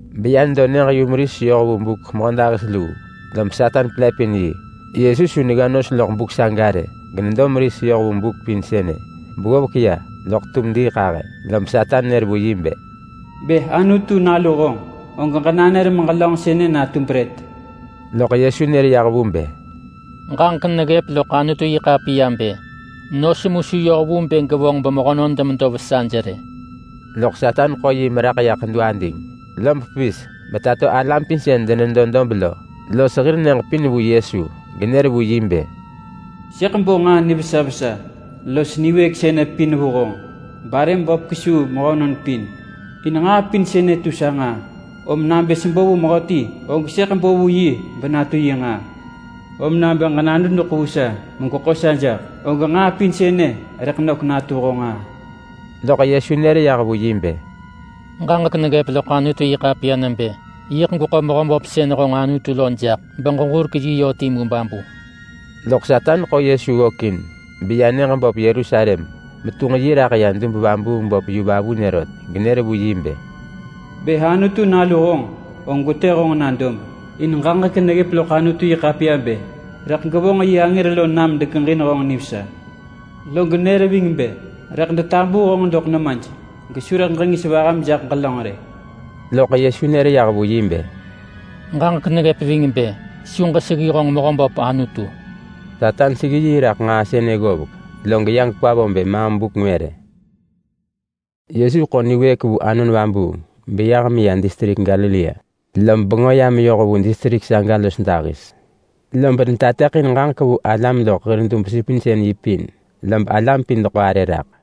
Beya nedo nyëġ-yumeris yoh vu buk mehödahis luu, lob Satan pelëpin yi. Yesu su negga nos loḳ buk saga rë, genedo meris yoh vu buk pin sënë beggovek ya loḳ tum diiḳahë. Lob Satan nër vu yi bë, “Bë Anutu nalu honġ, og ġenanër meġelönġ sënë natu brët.” Loḳ Yesu nër yah vu bë, “Ġaġek neggëp loḳ Anutu-yi-ḳapiya bë: Nos mu su yoh vu bë gevonġ bemehönon demedo vesaj rë.” Loḳ Satan ḳo yi meraḳ ya ḳedu ading, lob pevis betato alam pin sën denedo dob lo los hir nyëġ pin vu Yesu, genër vu yi bë, “Sëḳ bo nġaa nivesa vesa los niwëëk sënë pin vu honġ barëm böp jaḳ kesuu mehönon pin. In nġaa pin sënë tu sa nġaa. Om nabë sebo vu mehöti, og sëḳ bo vu yi benatu yi nġaa. Om nabë ġenadudeḳ vu sa megweḳo sa jaḳ, og nġaa pin sënë rëḳ nök natu honġ nġaa.” Loḳ Yesu nër yah vu yi bë, “Ġaġek neggëp loḳ Anutu-yi-ḳapiya nebë: Yiḳ gweḳo Mehöböp sën honġ Anutu lo jaḳ, beġeġurek yi yö timu babu.” Loḳ Satan ḳo Yesu ggökin beya nyëġ böp Yerusalem metunġ yi raḳ ya Dub-vabuung-böp yu vavunë rot, genër vu yi bë, “Bë Anutu Nalu honġ, og gwetë honġ na dob, in ġaġek neggëp loḳ Anutu-yi-ḳapiya bë: Rëḳ gevonġ yi angër lo nam degeġin honġ nivesa. Log nër ving bë: Rëḳ detabuu honġ doḳ nemaj, gesu rëḳ ġengis vaham jaḳ ġelönġ rë.” Loḳ Yesu nër yah vu yi bë, “Ġaġek neggëp ving bë: Su ġeseggi honġ Mehöböp Anutu.” Satan seggi yi raḳ nġaa sënë ggovek, log ya gekwa vo bë maam buk ngwë rë. Yesu ḳo niwëëk vu Anon Vabuung beyah meya distrik Galilea, lob bengö ya meyoh vu distrik saga los dahis. Lob netateḳin ġaġek vu alam loḳ hir dub-supinsën-yi pin, lob alam pin deḳo arë raḳ.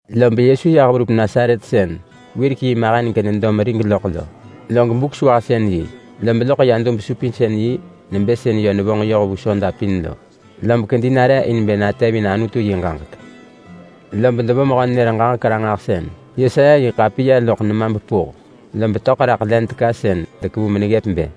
Lob Yesu yah verup Nasaret sën wirek yi mahen genedo merig loḳ lo, log Buk-sewahsën-yi, lob loḳ ya dub-supinsën-yi nebë sën yö nevonġ yoh vu soda pin lo. Lob kedi nare in bë natevin Anutu yi ġaġek. Lob devo mehö-nenër-ġaġek-ranġahsën Yesaya yi ḳapiya loḳ nema bepuh, lob töḳ raḳ len teka sën dekevu meneggëp bë: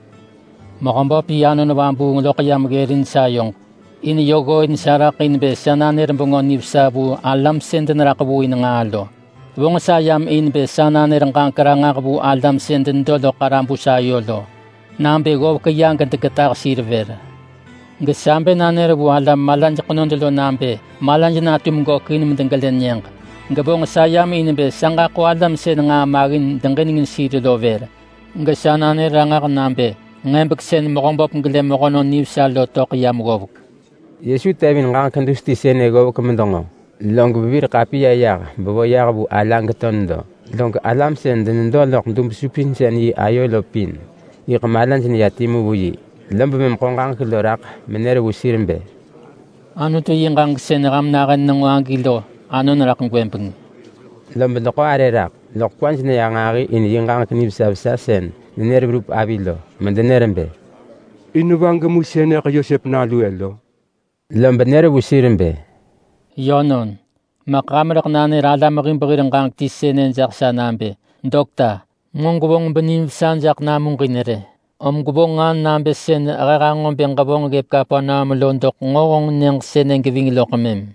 “Mehöböp yi Anon Vabuung loḳ yam ggërin sayoġ. In yö ggooin sa raḳ in bë sa nanër Bengö Nivesa vu alam sën deneraḳ vu in nġaa lo. Vonġ sa yam in bë sa nanër ġaġek ranġah vu alam sën denedo loḳ ḳarabus ayo lo nabë ggovek ya gedegetah sir vër. Gesa bë nanër vu alam malaj ḳenod lo nabë malaj natum gökin medegelë nyëġ. Ġevonġ sa yam in bë sa ġaḳo alam sën nġaa maggin deġinengin sir lo vër, gesa nanër ranġah nabë nġebek sën Mehöböp gelë mehönon nivesa lo töḳ yam ggovek.” Yesu tevin ġaġek dus ti sënë ggovek medenġo, lob vevir ḳapiya yah bevo yah vu ala geto nedo. Log alam sën denedo loḳ dub-supinsën-yi ayo lo pin yiḳ malaj neya timu vu yi. Lob mëm ḳo ġaġek lo raḳ menër vu sir bë, “Anutu yi ġaġek sën ham nahën nenġo agi lo anon raḳ gwëbeng.” Lob deḳo arë raḳ, loḳ kwaj neya nġahi in yi ġaġek nivesa vesa sën nenër verup avi lo, medenër bë, “In va gemu sënëḳ Yosep nalu-ë lo?” Lob nër vu sir bë, “Yönon, maḳ ham rëḳ nanër alam hib hir ġaġek ti sënë jaḳ sa nabë, ‘Dokta! Nġo gwevonġ benim vesa jaḳ namuġin rë. Om gwevonġ nġaa nabë sën he hanġo bë ġevonġ ggëp Kapernaum lo doḳ nġo honġ nyëġ sënë geving loḳ mëm.’”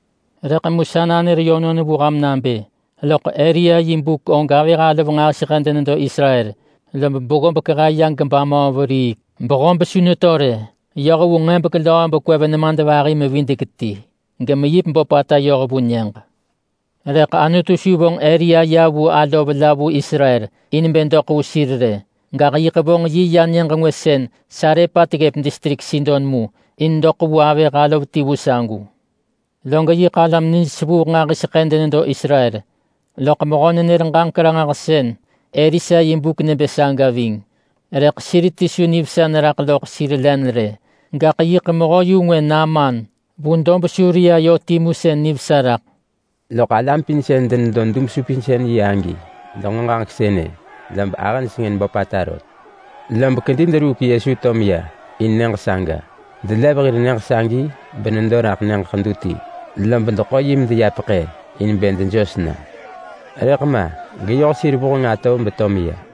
Rëḳ mu sa nanër yönon vu ham nabë: Loḳ Elia yi buk og avëh alov nġahiseḳë denedo Israel. Lob beggob kehe ya gebamöö veriik, behob su neto rë yoh vu nġebek löö bekwev nemadvahi-mevidek-ti. Gemeyip böpata yoh vu nyëġ. Rëḳ Anutu su vonġ Elia ya vu alov la vu Israel in bë doḳ vu sir rë. Gaḳ mëm yiḳ vonġ yi meya nyëġ ngwë vu Sarepat ggëp distrik Sidon mu in doḳ vu avëh alov ti vu sagu. Log yiḳ alam nij sevuuḳ nġahiseḳë denedo Israel loḳ mehö-nenër-ġaġek-ranġahsën Elisa yi buk nebë saga ving. Rëḳ sir ti su nivesa neraḳ loḳ sir len rë. Gaḳ yiḳ mehö-yu-ngwë Naaman vu dob Suria yö timu sën nivesa raḳ.” Loḳ alam pin sën denedo dub-supinsën-yi agi denġo ġaġek sënë, lob ahëj sengën böpata rot. Lob dekedi deruuk Yesu to meya in nyëġ saga. Delev hir nyëġ sagi benedo raḳ nyëġ ḳedu ti, lob deḳo yi medeya peḳë in bë dejos na. Rëḳ ma geyoh sir vuheng atov beto meya.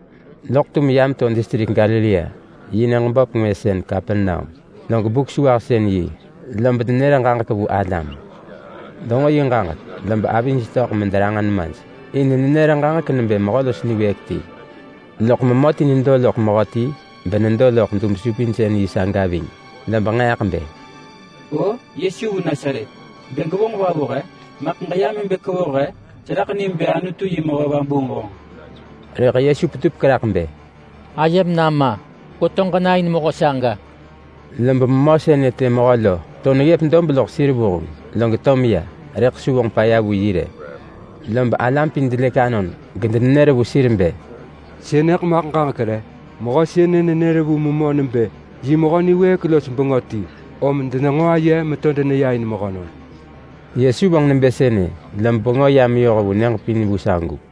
Loḳ tum ya meto distrik Galilea yi nyëġ böp ngwë sën Kapernaum. Log Buk-sewahsën-yi, lob nenër ġaġek vu alam. Denġo yi ġaġek, lob avij töḳ mederanġa nemaj in nenër ġaġek nebë mehö los niwëëk ti. Loḳ memö ti nedo loḳ mehö ti benedo loḳ dub-supinsën-yi saga ving, lob nġeeḳ bë, “O! Yesu vu Nasaret, bë gwevonġ va vu he? Maḳ ġeyam in bë kwevoh he? Seraḳ nim bë Anutu yi mehö vabuung honġ.” Rëḳ Yesu petupek raḳ bë, “Ayem nama! Ġegweto ġena in mehö saga!” Lob memö sënë të mehö lo to neggëp dob loḳ sir vuheng, log to meya, rëḳ su vonġ paya vu yi rë. Lob alam pin delëk anon gedenenër vu sir bë, “Sënëḳ maḳ ġaġek re? Mehö sënë nenër vu memö nebë yi mehö niwëëk los bengö ti, om denenġo aye meto deneya in mehönon.” Yesu vonġ nebë sënë, lob bengö ya meyoh vu nyëġ pin vu sagu.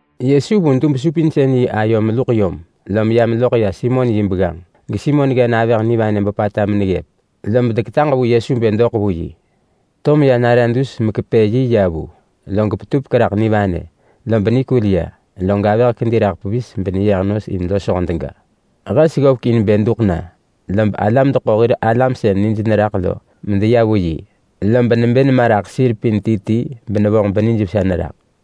Yesu vu dub-supinsën-yi ayo meluḳ yom, lom ya meloḳ ya Simon yi begganġ, geSimon ggen avëh nivanë böpata meneggëp. Lob deketaġ vu Yesu bë doḳ vu yi. To meya nare dus mekepë yi ya vu, log petupek raḳ nivanë, lob nikul ya. Log avëh kedi raḳ pevis beneyeh nos in losho dega. Hes ggovek in bë duḳ na, lob alam deḳo hir alam sën nij neraḳ lo medeya vu yi. Lob nebë nema raḳ sir pin ti ti benevonġ benijvesa neraḳ.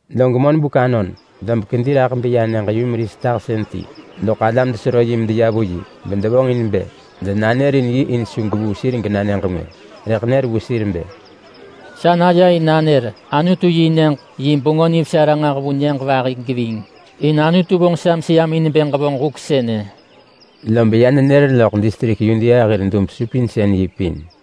Log monbuk anon, lob kedi raḳ beya nyëġ-yumeris tahsën ti. Loḳ alam desero yi medeya vu yi bedevonġin bë denanërin yi in su gevuu sir gena nyëġ ngwë. Rëḳ nër vu sir bë, “Sa naya in nanër Anutu-yi-nyëġ yi Bengö Nivesa ranġah vu nyëġ vahi geving. In Anutu vonġ sa meseyam in bë ġevonġ huk sënë.” Lob ya nenër loḳ distrik Yudea hir dub-supinsën-yi pin.